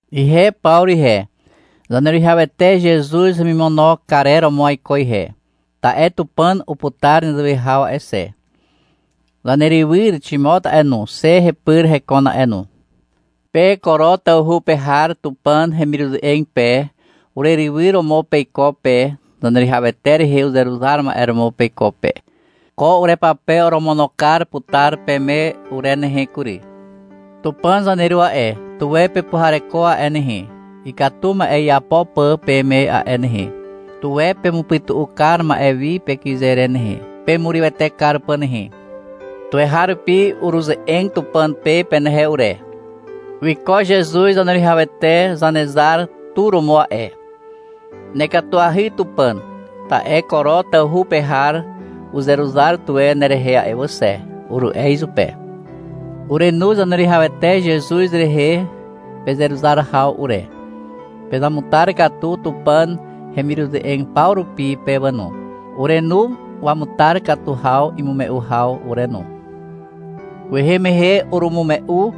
Ihe Pawru ihe, Zaneruwihawete Zezuz hemimono karer romo aiko ihe, ta'e Tupàn uputar nezewe haw a'e xe. Zanerywyr Ximot a'e no, xe hepyr hekon a'e no. Pe Koro tawhu pe har Tupàn hemiruze'eg pe, urerywyr romo peiko pe, Zaneruwihawete rehe uzeruzar ma'e romo peiko pe. Ko urepape oromono kar putar peme ure nehe kury. Tupàn zaneru a'e, tuwe pepuhareko a'e nehe, ikatu ma'e iapo pà peme a'e nehe. Tuwe pemupytu'u kar ma'e wi pekyze re nehe, pemurywete kar pà nehe. Tuweharupi uruze'eg Tupàn pe penehe ure. Wiko Zezuz Zaneruwihawete Zanezar tu romo a'e. — Nekatuahy Tupàn, ta'e Koro tawhu pe har uzeruzar tuwe nerehe a'e wà xe, uru'e izupe. Urenu Zaneruwihawete Zezuz rehe pezeruzar haw ure. Pezamutar katu Tupàn hemiruze'eg paw rupi pe wà no. Urenu wamutar katu haw imume'u haw ure no. Kwehe mehe urumume'u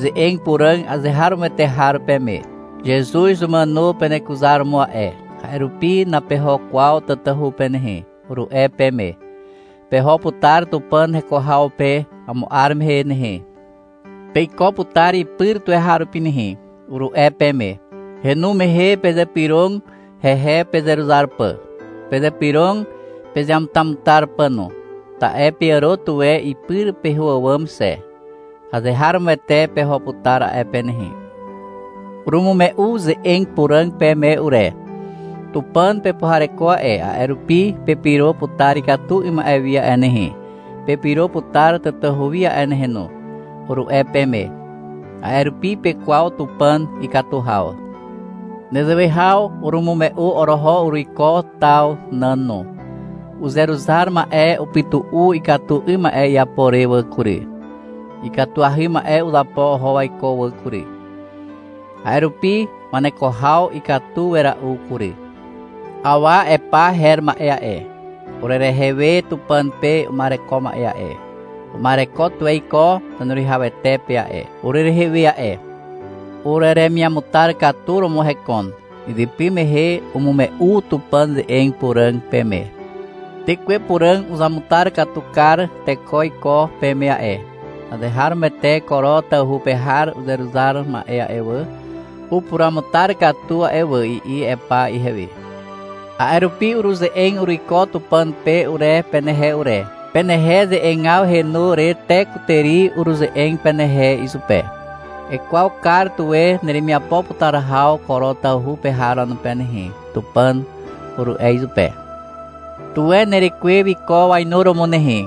ze'eg puràg azeharomoete har peme. — Zezuz umàno penekuzaromo a'e, a'e rupi napeho kwaw tatahu pe nehe, uru'e peme. — Peho putar Tupàn heko haw pe amo 'ar mehe nehe. Peiko putar ipyr tuweharupi nehe, uru'e peme. Henu mehe pezypyrog hehe pezeruzar pà. Pezypyrog pezeamutamutar pà no. Ta'e peàro tuwe ipyr peho àwàm xe. Azeharomoete peho putar a'e pe nehe. Urumume'u ze'eg puràg peme ure. — Tupàn pepuhareko a'e, a'e rupi pepyro putar ikatu 'ym ma'e wi a'e nehe, pepyro putar tatahu wi a'e nehe no, uru'e peme. A'e rupi pekwaw Tupàn ikatu haw. Nezewe haw urumume'u oroho uruiko taw nàn no. Uzeruzar ma'e upytu'u ikatu 'ym ma'e iapo re wà kury. Ikatuahy ma'e uzapo oho waiko wà kury. A'e rupi waneko haw ikatu wera'u kury. Awa Epa her ma'e a'e, urerehe we Tupàn pe uma'ereko ma'e a'e, uma'ereko tuwe iko Zaneruwihawete pe a'e, urerehe we a'e. Ureremiamutar katu romo hekon. Izypy mehe umume'u Tupàn ze'eg puràg peme. Tekwe Puràg uzamutar katu kar teko iko peme a'e. — Azeharomoete Koro tawhu pe har uzeruzar ma'e a'e wà, upuruamutar katu a'e wà, i'i Epa ihewe. A'e rupi uruze'eg uruiko Tupàn pe ure, penehe ure. Penehe ze'egaw henu re te kutàri uruze'eg penehe izupe. — Ekwaw kar tuwe neremiapo putar haw Koro tawhu pe har wanupe nehe, Tupàn, uru'e izupe. — Tuwe nerekwe wiko wainuromo nehe.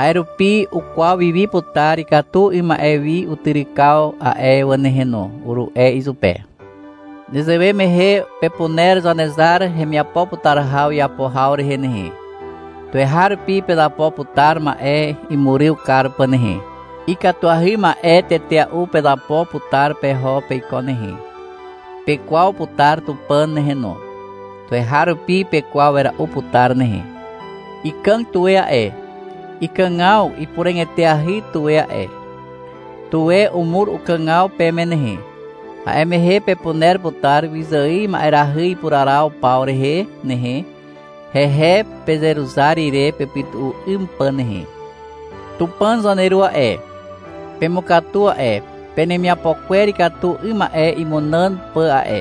A'e rupi ukwaw wiwi putar ikatu 'ym ma'e wi utyrykaw a'e wà nehe no, uru'e izupe. Nezewe mehe pepuner Zanezar hemiapo putar haw iapo haw rehe nehe. Tuweharupi pezapo putar ma'e imuryw kar pà nehe. Ikatuahy ma'e tetea'u pezapo putar peho peiko nehe. Pekwaw putar Tupàn nehe no. Tuweharupi pekwaw wera'u putar nehe. Ikàg tuwe a'e. Ikàgaw ipuràg eteahy tuwe a'e. Tuwe umur ukàgaw peme nehe. A'e mehe pepuner putar wyzài ma'erahy ipuraraw paw rehe nehe, hehe pezeruzar ire pepytu'u 'ym pà nehe. Tupàn zaneru a'e, pemukatu a'e, penemiapo kwer ikatu 'ym ma'e imunàn pà a'e.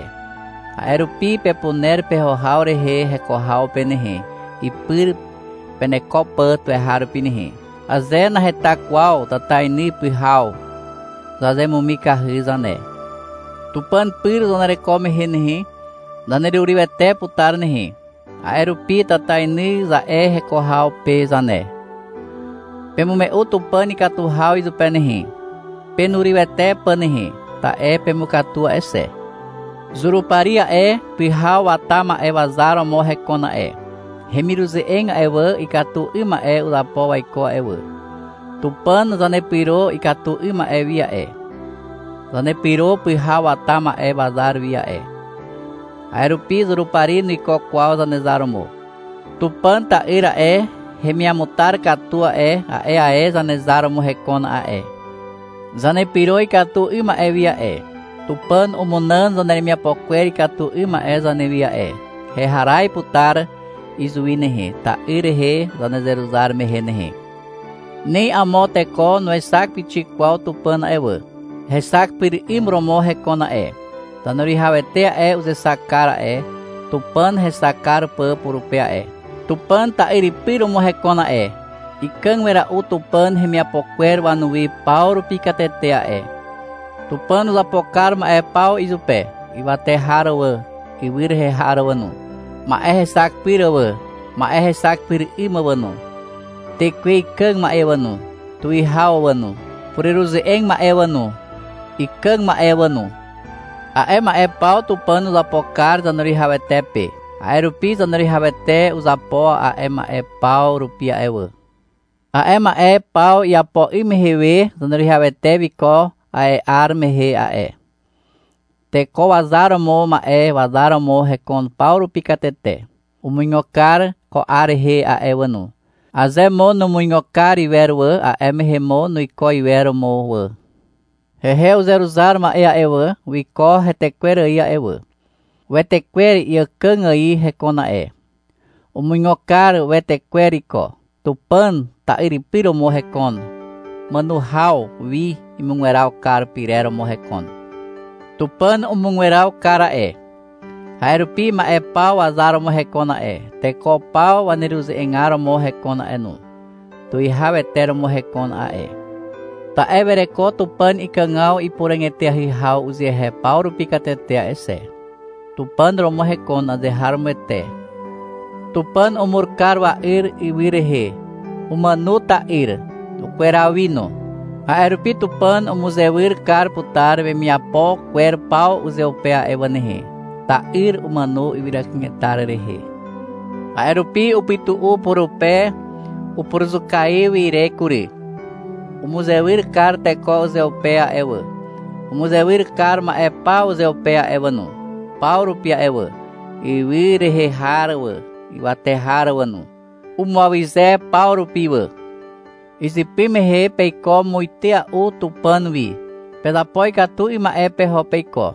A'e rupi pepuner peho haw rehe heko haw pe nehe, ipyr peneko pà tuweharupi nehe. Aze naheta kwaw tatainy pyhaw, zazemumikahy zane. Tupàn pyr zanereko mehe nehe, zanerurywete putar nehe. A'e rupi, — Tatainy, za'e heko haw pe zane. Pemume'u Tupàn ikatu haw izupe nehe, penurywete pà nehe, ta'e pemukatu a'e xe. Zurupari a'e, pyhaw wata ma'e wazar romo hekon a'e. Hemiruze'eg a'e wà, ikatu 'ym ma'e uzapo waiko a'e wà. Tupàn zanepyro ikatu 'ym ma'e wi a'e. Zanepyro pyhaw wata ma'e wazar wi a'e. A'e rupi Zurupari nuiko kwaw zanezar romo. Tupàn ta'yr a'e, hemiamutar katu a'e, a'e ae Zanezar romo hekon a'e. Zanepyro ikatu 'ym ma'e wi a'e. Tupàn umunàn zaneremiapo kwer ikatu 'ym ma'e zanewi a'e. Heharaz putar izuwi nehe, ta'yr rehe zanezeruzar mehe nehe. Ni amo teko nuexak pixik kwaw Tupàn a'e wà. Hexak pyr 'ym romo hekon a'e. Zaneruwihawete a'e, uzexak kar a'e, Tupàn hexak kar pà purupe a'e. Tupàn ta'yripy romo hekon a'e. Ikàg wera'u Tupàn hemiapo kwer wanuwi paw rupi katete a'e. Tupàn uzapo kar ma'e paw izupe, ywate har wà, ywy rehe har wà no, ma'e hexak pyr wà, ma'e hexak pyr 'ym wà no, tekwe ikàg ma'e wà no, tuwihaw wà no, pureruze'eg ma'e wà no, ikàg ma'e wà no. A'e ma'e paw Tupàn uzapo kar Zaneruwihawete pe. (A'e rupi Zaneruwihawete uzapo a'e ma'e paw rupi a'e wà.) A'e ma'e paw iapo 'ym mehe we Zaneruwihawete wiko a'e 'ar mehe a'e. Teko wazar romo ma'e wazar romo hekon paw rupi katete. Umuigo kar ko 'ar rehe a'e wà no. Aze mo numuigo kar iwer wà, a'e mehe mo nuiko iwer mo wà. Hehe uzeruzar ma'e a'e wà, wiko hetekwer ài a'e wà. Wetekwer iàkàg ài hekon a'e. Umuigo kar wetekwer iko. Tupàn ta'yripy romo hekon, màno haw wi imugweraw kar pyrer romo hekon. Tupàn umugweraw kar a'e. A'e rupi ma'e paw wazar romo hekon a'e, teko paw waneruze'egar romo hekon a'e no. Tuwihawete romo hekon a'e. Ta'e wereko Tupàn ikàgaw ipuràg eteahy haw uzehe paw rupi katete a'e xe. Tupàn romo hekon azeharomoete. Tupàn umur kar wa'yr ywy rehe. Umàno ta'yr. Ukweraw wi no. A'e rupi Tupàn umuzewyr kar putar wemiapo kwer paw uzeupe a'e wà nehe. Ta'yr umàno ywyra kanetar rehe. A'e rupi upytu'u purupe upuruzukaiw ire kury. Umuzewyr kar teko uzeupe a'e wà, umuzewyr kar ma'e paw uzeupe a'e wà no, paw rupi a'e wà, ywy rehe har wà, ywate har wà no. Umuawyze paw rupi wà. Izypy mehe peiko muitea'u Tupàn wi. Pezapo ikatu 'ym ma'e peho peiko.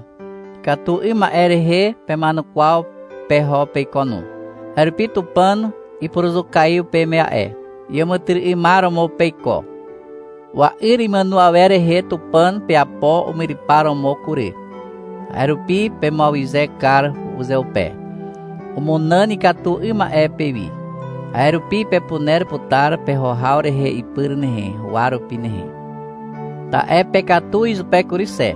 Ikatu 'ym ma'e rehe pema'enukwaw peho peiko no. A'e rupi Tupàn ipuruzukaiw peme a'e. Iàmàtyry'ymar romo peiko. Wa'yr imàno awer rehe Tupàn peapo umyrypar romo kury. A'e rupi pemuawyze kar uzeupe. Umunàn ikatu 'ym ma'e pewi. A'e rupi pepuner putar peho haw rehe ipyr nehe, huwa rupi nehe. Ta'e pekatu izupe kury xe.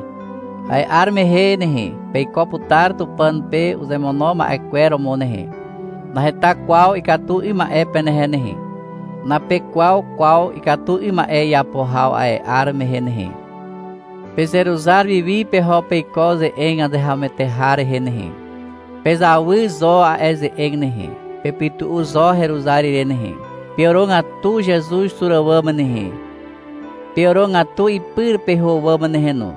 A'e 'ar mehe nehe, peiko putar Tupàn pe uzemono ma'e kwer romo nehe. Naheta kwaw ikatu 'ym ma'e penehe nehe. Napekwaw kwaw ikatu 'ym ma'e iapo haw a'e 'ar mehe nehe. Pezeruzar wiwi peho peiko ze'eg azeharomoete har rehe nehe. Pezawy zo a'e ze'eg nehe. Pepytu'u zo heruzar ire nehe. Peàrogatu Zezuz tur àwàm nehe, peàrogatu ipyr peho àwàm nehe no.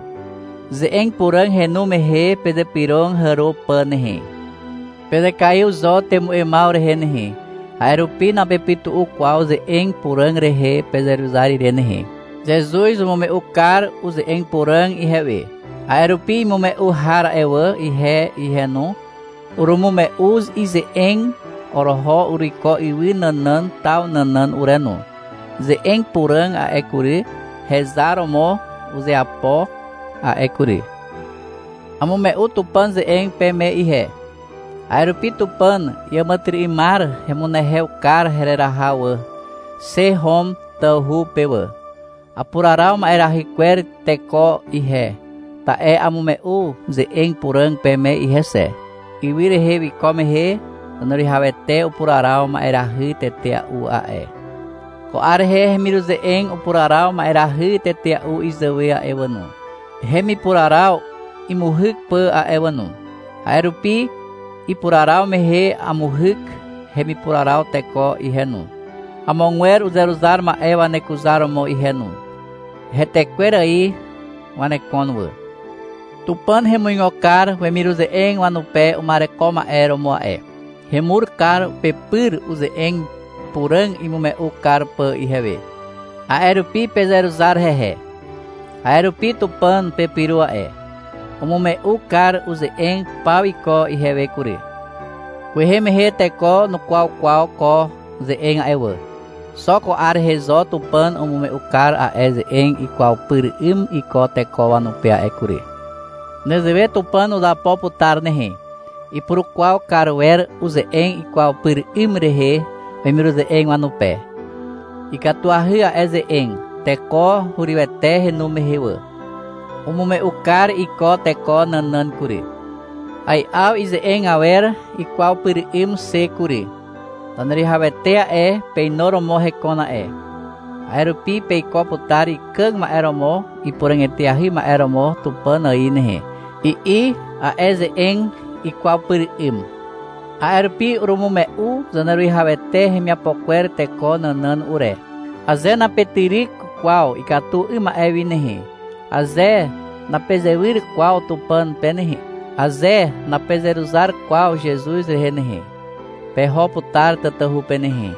Ze'eg puràg henu mehe pezypyrog hàro pà nehe. Pezekaiw zo temu'emaw rehe nehe, a'e rupi napepytu'u kwaw ze'eg puràg rehe pezeruzar ire nehe. Zezuz umume'u kar uze'eg puràg ihewe. A'e rupi imume'u har a'e wà, ihe ihe no, urumume'u ize'eg oroho uruiko ywy nànàn taw nànàn ure no. Ze'eg puràg a'e kury, hezar romo uzeapo a'e kury. Amume'u Tupàn ze'eg peme ihe. A'e rupi Tupàn iàmàtyry'ymar hemunehew kar hereraha wà, xe Hom tawhu pe wà. Apuraraw ma'erahy kwer teko ihe, ta'e amume'u ze'eg puràg peme ihe xe. Ywy rehe wiko mehe Zaneruwihawete upuraraw ma'erahy tetea'u a'e. Ko 'ar rehe hemiruze'eg upuraraw ma'erahy tetea'u izàwe a'e wà no, hemipuraraw imuhyk pà a'e wà no. A'e rupi ipuraraw mehe amuhyk hemipuraraw teko ihe no, amogwer uzeruzar ma'e wanekuzar romo ihe no. Hetekwer ài wanekon wà. Tupàn hemuigo kar wemiruze'eg wanupe uma'ereko ma'e romo a'e. Hemur kar pepyr, uze'eg puràg imume'u kar pà ihewe. A'e rupi pezeruzar hehe. A'e rupi Tupàn pepyro a'e. Umume'u kar uze'eg paw iko ihewe kury. Kwehe mehe teko nukwaw kwaw ko ze'eg a'e wà. Xo ko 'ar rehe zo Tupàn umume'u kar a'e ze'eg ikwaw pyr 'ym iko teko wanupe a'e kury. Nezewe Tupàn uzapo putar nehe. Ipurukwaw kar wer uze'eg ikwaw pyr 'ym rehe wemiruze'eg wanupe. Ikatuahy a'e ze'eg, teko hurywete henu mehe wà. Umume'u kar iko teko nànàn kury. Ai'aw ize'eg awer ikwaw pyr 'ym xe kury. Zaneruwihawete a'e, peinuromo hekon a'e. A'e rupi peiko putar ikàg ma'e romo ipuràg eteahy ma'e romo Tupàn ài nehe, i'i a'e ze'eg ikwaw pyr 'ym. A'e rupi urumume'u Zaneruwihawete hemiapo kwer teko nànàn ure. — Aze napetyryk kwaw ikatu 'ym ma'e wi nehe, aze napezewyr kwaw Tupàn pe nehe, aze napezeruzar kwaw Zezuz rehe nehe, peho putar tatahu pe nehe,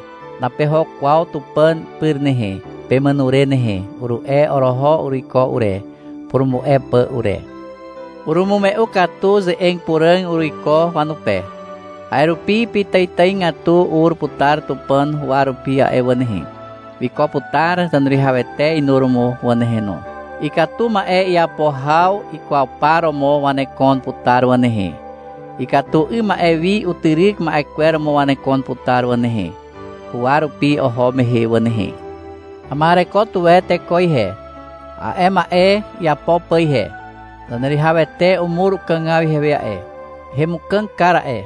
napeho kwaw Tupàn pyr nehe, pemàno re nehe, uru'e oroho uruiko ure, purumu'e pà ure. Urumume'u katu ze'eg puràg uruiko wanupe. A'e rupi pitàitàigatu ur putar Tupàn huwa rupi a'e wà nehe. Wiko putar Zaneruwihawete inuromo wà nehe no. Ikatu ma'e iapo haw ikwaw par romo wanekon putar wà nehe, ikatu 'ym ma'e wi utyryk ma'e romo wanekon putar wà nehe, huwa rupi oho mehe wà nehe. Ama'ereko tuwe teko ihe, a'e ma'e iapo pà ihe. Zaneruwihawete umur ukàgaw ihewe a'e. Hemukàg kar a'e.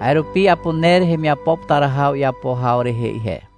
A'e rupi apuner hemiapo putar haw iapo haw rehe ihe.